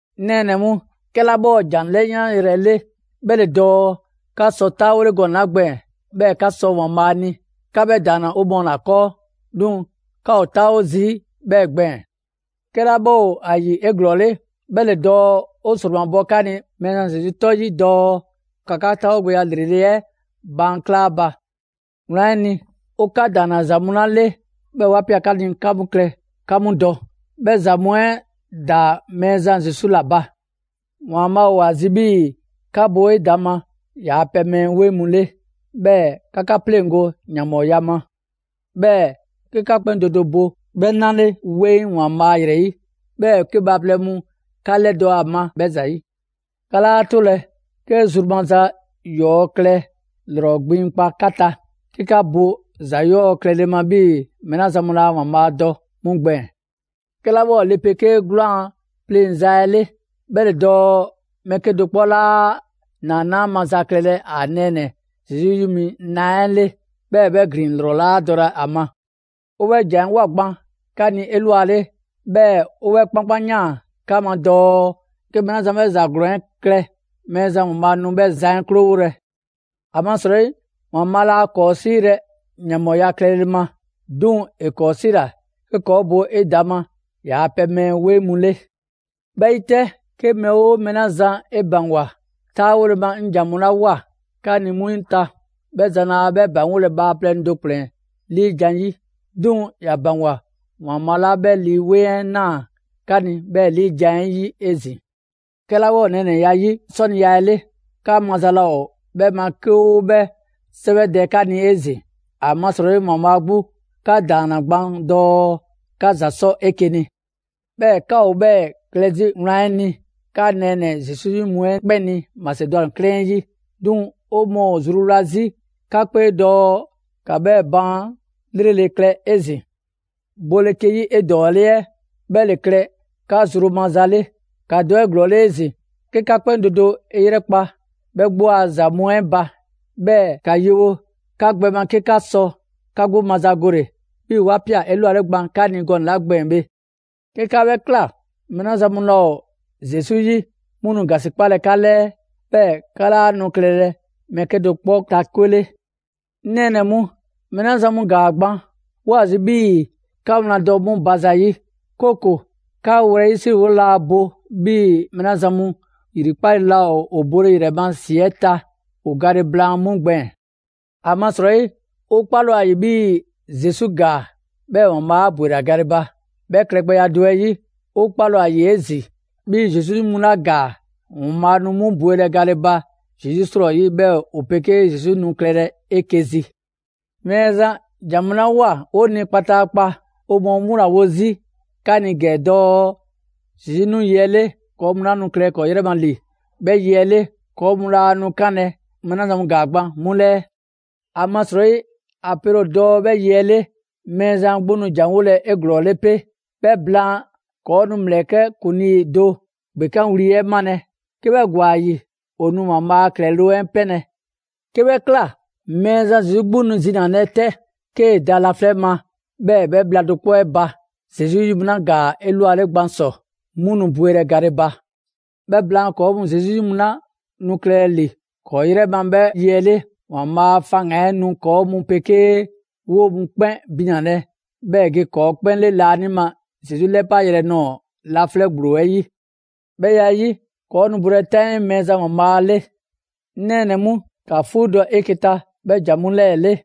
'O nɛɛnɛ‑ mu, 'kɛla 'bhɛ ‑o ‑jan 'lɛyanyrɛ 'le 'bhɛ ‑le dɔɔ 'ka sɔ 'taawole gɔnɛ‑ 'la gbɛɛn‑, 'bhɛɛ‑ 'ka sɔ ‑Waanbhaa' ni, 'ka 'bhɛ ‑daanna 'o mɔɔ ‑la 'kɔɔ. 'Duŋ‑ 'ka ‑o 'taawo zii' 'bhɛɛ‑ gbɛɛn‑. 'Kɛla 'bhɛ ‑o ‑a ‑yi 'eglɔɔle, 'bhɛ ‑le dɔɔ 'o ‑sromabɔ 'ka ni Mɛɛzan Zesu 'tɔ 'yi dɔɔ ‑ka 'ka 'taawogbɛya ‑lrele' 'ɛ baan' 'kla a ba. Wlan 'ɛ ni, 'o 'ka ‑daanna ‑za mu 'la 'le, 'bhɛɛ‑ 'wa ꞊pia 'ka ni 'ka 'mu klɛ 'ka 'mu dɔ; 'bhɛ ‑za mu 'ɛ ‑daa Mɛɛzan Zesu ‑la ba. ‑Waanbhaa' ‑o ‑a zi 'bhii‑ 'ka bo 'edaŋma ‑yaa' pɛ mɛɛ 'weŋ mu 'le, 'bhɛɛ‑ 'ka 'ka 'pleŋgo‑ ‑yanbhɔɔya ma. 'Bhɛɛ‑ 'ke 'ka 'kpɛn do do bo 'bhɛ 'na 'le 'weŋ ‑Waanbhaa' ‑yrɛ 'yi, 'bhɛɛ‑ 'ke bhaaplɛŋ mu 'ka ‑lɛdɔ' ‑a ma 'bhɛ ‑zayi'. 'Ka 'laa 'tolɛ‑ 'ke zru maza ‑yɔɔ' klɛ ‑lrɔ gbiŋkpa 'ka ta, 'ke 'ka bo ‑za 'yɔɔ‑ klɛle ma 'bhii‑ mɛɛ 'la zan mu laa ‑Waanbhaa' dɔ 'mu gbɛɛn‑. 'Kɛla 'bhɛ ‑o le 'pegee 'gwlaan‑ pleŋza 'ɛ 'le, 'bhɛ ‑le dɔɔ mɛɛ 'kedo‑ 'kpɔ 'laa ‑naanaa' maza klɛlɛ ‑a nɛɛnɛ‑ Zesu 'yi mi na 'ɛ 'le, 'bhɛɛ‑ 'bhɛ ‑glin 'lrɔ 'laa dɔlɛ ‑a ma. 'O 'bhɛ ‑jan 'ɛ ꞊woa gban 'ka ni 'elwale, 'bhɛɛ‑ 'o 'bhɛ 'kpankpanyaan 'ka ma dɔɔ 'ke mɛɛ 'la zan 'bhɛ ‑za ‑glɔɔn 'ɛ klɛ, Mɛɛzan ‑Waanbhaa' nu 'bhɛ zan 'ɛ 'krowolɛ. ‑Amasrɔyi ‑Waanbhaa' laa ‑kɔɔ' 'siilɛ‑ ‑yanbhɔɔya klɛle ma, 'duŋ‑ ‑e ‑kɔɔ' 'siila‑ 'ke ‑kɔɔ' bo 'edaŋma ‑yaa' pɛ mɛɛ 'weŋ mu 'le. 'Bhɛ 'yi 'tɛ, 'ke mɛɛ 'oo mɛɛ 'la zan 'e ‑baŋgwa 'taawole ma 'ŋ ‑jan mu 'la 'woa‑ 'ka ni 'mu ta, 'bhɛ zan 'laa 'bhɛ ‑baŋgolɛ bhaaplɛŋ do ‑kplɛn 'liijan‑ 'yi; 'duŋ‑ ‑ya ‑baŋgwa ‑Waanbhaa' 'la 'bhɛ Lii 'Weŋ 'ɛ ꞊naa 'ka ni 'bhɛɛ‑ 'liijan‑ 'ɛ 'yi 'ezin‑. 'Kɛla 'bhɛ ‑o nɛɛnɛya 'yi 'sɔniya 'ɛ 'le, 'ka maza laa ‑o 'bhɛ ma 'ke ‑o 'bhɛ 'sɛwɛdɛ 'ka ni 'ezin‑; ‑amasrɔyi ‑Waanbhaa' 'gbu 'ka ‑daanna gban dɔɔ 'ka ‑za 'sɔ 'eke‑ ni. 'Bhɛɛ‑ 'ka ‑o 'bhɛɛ‑ klɛ 'zi wlan 'ɛ ni 'ka nɛɛnɛ‑ Zesu 'yi mu 'ɛ 'kpɛn ni Masedwani 'klɛɛn 'ɛ 'yi. 'Duŋ‑ 'o mɔɔ ‑o zruwla 'zi 'ka 'kpee dɔɔ ‑ka 'bhɛɛ‑ baan' 'lrele‑ klɛ 'ezin‑. Bole 'ke 'yi 'edɔɔle 'ɛ, 'bhɛ ‑le klɛ 'ka zru maza 'le. ‑Ka dɔ 'eglɔɔle 'ezin‑ 'ke 'ka 'kpɛn do do 'e 'yrɛkpa‑ 'bhɛ 'gbu a ‑za mu 'ɛ ba, 'bhɛɛ‑ ‑ka yewo 'ka gbɛ ma 'ke 'ka sɔ 'ka 'gbu mazagole, 'bhii‑ 'wa ꞊pia 'elwale gban 'ka ni gɔnɛ‑ 'la gbɛɛn‑ bhe. 'Ke 'ka 'bhɛ ꞊kla, mɛɛ 'la zan mu laa 'o Zesu 'yi 'mu nu ‑gasikpalɛ 'ka 'lɛɛ, 'bhɛɛ‑ 'ka 'laa nu klɛlɛ mɛɛ 'kedo‑ 'kpɔ ta 'kwe 'le. 'Ŋ nɛɛnɛ‑ mu, mɛɛ 'la zan mu ‑gaa gban, 'woo‑ ‑a zi 'bhii‑ 'ka wlan dɔ 'mu ba ‑zayi', 'kooko‑ 'ka wlɛyisriwole laa bo 'bhii‑ mɛɛ 'la zan mu yrikpale laa ‑o bole ‑yrɛ ma ‑si 'ɛ ta ‑o gale blaan 'mu gbɛɛn‑. ‑Amasrɔyi, 'o 'kpale‑ ‑o ‑a ‑yi 'bhii‑ Zesu ‑gaa, 'bhɛɛ‑ ‑Waanbhaa' 'a ‑bwela gale ba. 'Bhɛ klɛgbɛya do 'ɛ 'yi, 'o 'kpale‑ ‑o ‑a ‑yi 'ezin‑ 'bhii‑ Zesu 'yi mu 'la ‑gaa, ‑Waanbhaa' nu 'mu bwelɛ gale ba Zesu 'srɔyi, 'bhɛɛ‑ ‑o pegee Zesu nu klɛlɛ 'eke‑ zi. Mɛɛzan ‑jan 'la ꞊woa 'o ni kpataakpa, 'o mɔɔ 'mu ‑la wo zii' 'ka ni ‑gɛ dɔɔ Zesu 'nu yi 'ɛ 'le, ‑kɔɔ' mu 'la nu klɛlɛ ‑kɔɔ' 'yrɛ ma ‑li 'bhɛ yi 'ɛ 'le, ‑kɔɔ mu laa nu 'kanlɛ‑ mɛɛ 'la zan mu ‑gaa gban 'mu 'lɛɛ. ‑Amasrɔyi ‑a pele ‑o dɔɔ 'bhɛ yi 'ɛ 'le, Mɛɛzan 'gbu nu ‑janwolɛ 'eglɔɔle 'pe, 'bhɛ blaan, ‑kɔɔ' nu ‑mlɛkɛ' ‑kuŋlii do ‑gbekanwli 'ɛ 'malɛ‑. 'Ke 'bhɛ ‑gwa ‑a ‑yi, ‑o nu ‑Waanbhaa' a ‑klɛloŋ' 'ɛ 'pɛnlɛ‑. 'Ke 'bhɛ ꞊kla, Mɛɛzan Zesu 'gbu nu zinalɛ 'tɛ, 'kee‑ da laflɛ' ma, 'bhɛɛ‑ 'bhɛ bhla do 'kpɔ 'ɛ ba, Zesu 'yi mu 'la ‑gaa 'elwale gban ‑sɔ, 'mu nu bwelɛ gale ba. 'Bhɛ blaan, ‑kɔɔ' mu Zesu 'yi mu 'la nu klɛlɛ ‑li 'kɔɔ‑ 'yrɛ ma 'bhɛ yi 'ɛ 'le, ‑Waanbhaa' a faŋgan‑ 'ɛ nu ‑kɔɔ' mu 'pegee 'woo‑ mu 'kpɛn binalɛ, 'bhɛɛ‑ ‑e ge ‑kɔɔ' 'kpɛn 'le laanima Zesu 'lɛpayrɛ nɔɔ‑ laflɛ' ‑gblo 'ɛ 'yi. 'Bhɛ ya 'ɛ 'yi, ‑kɔɔ' nu bolɛ 'taŋii Mɛɛzan ‑Waanbhaa' 'le. 'Ŋ nɛɛnɛ‑ mu, ‑ka 'fuudɔ‑ 'eke‑ ta 'bhɛ ‑jan mu 'lɛɛ‑ 'le.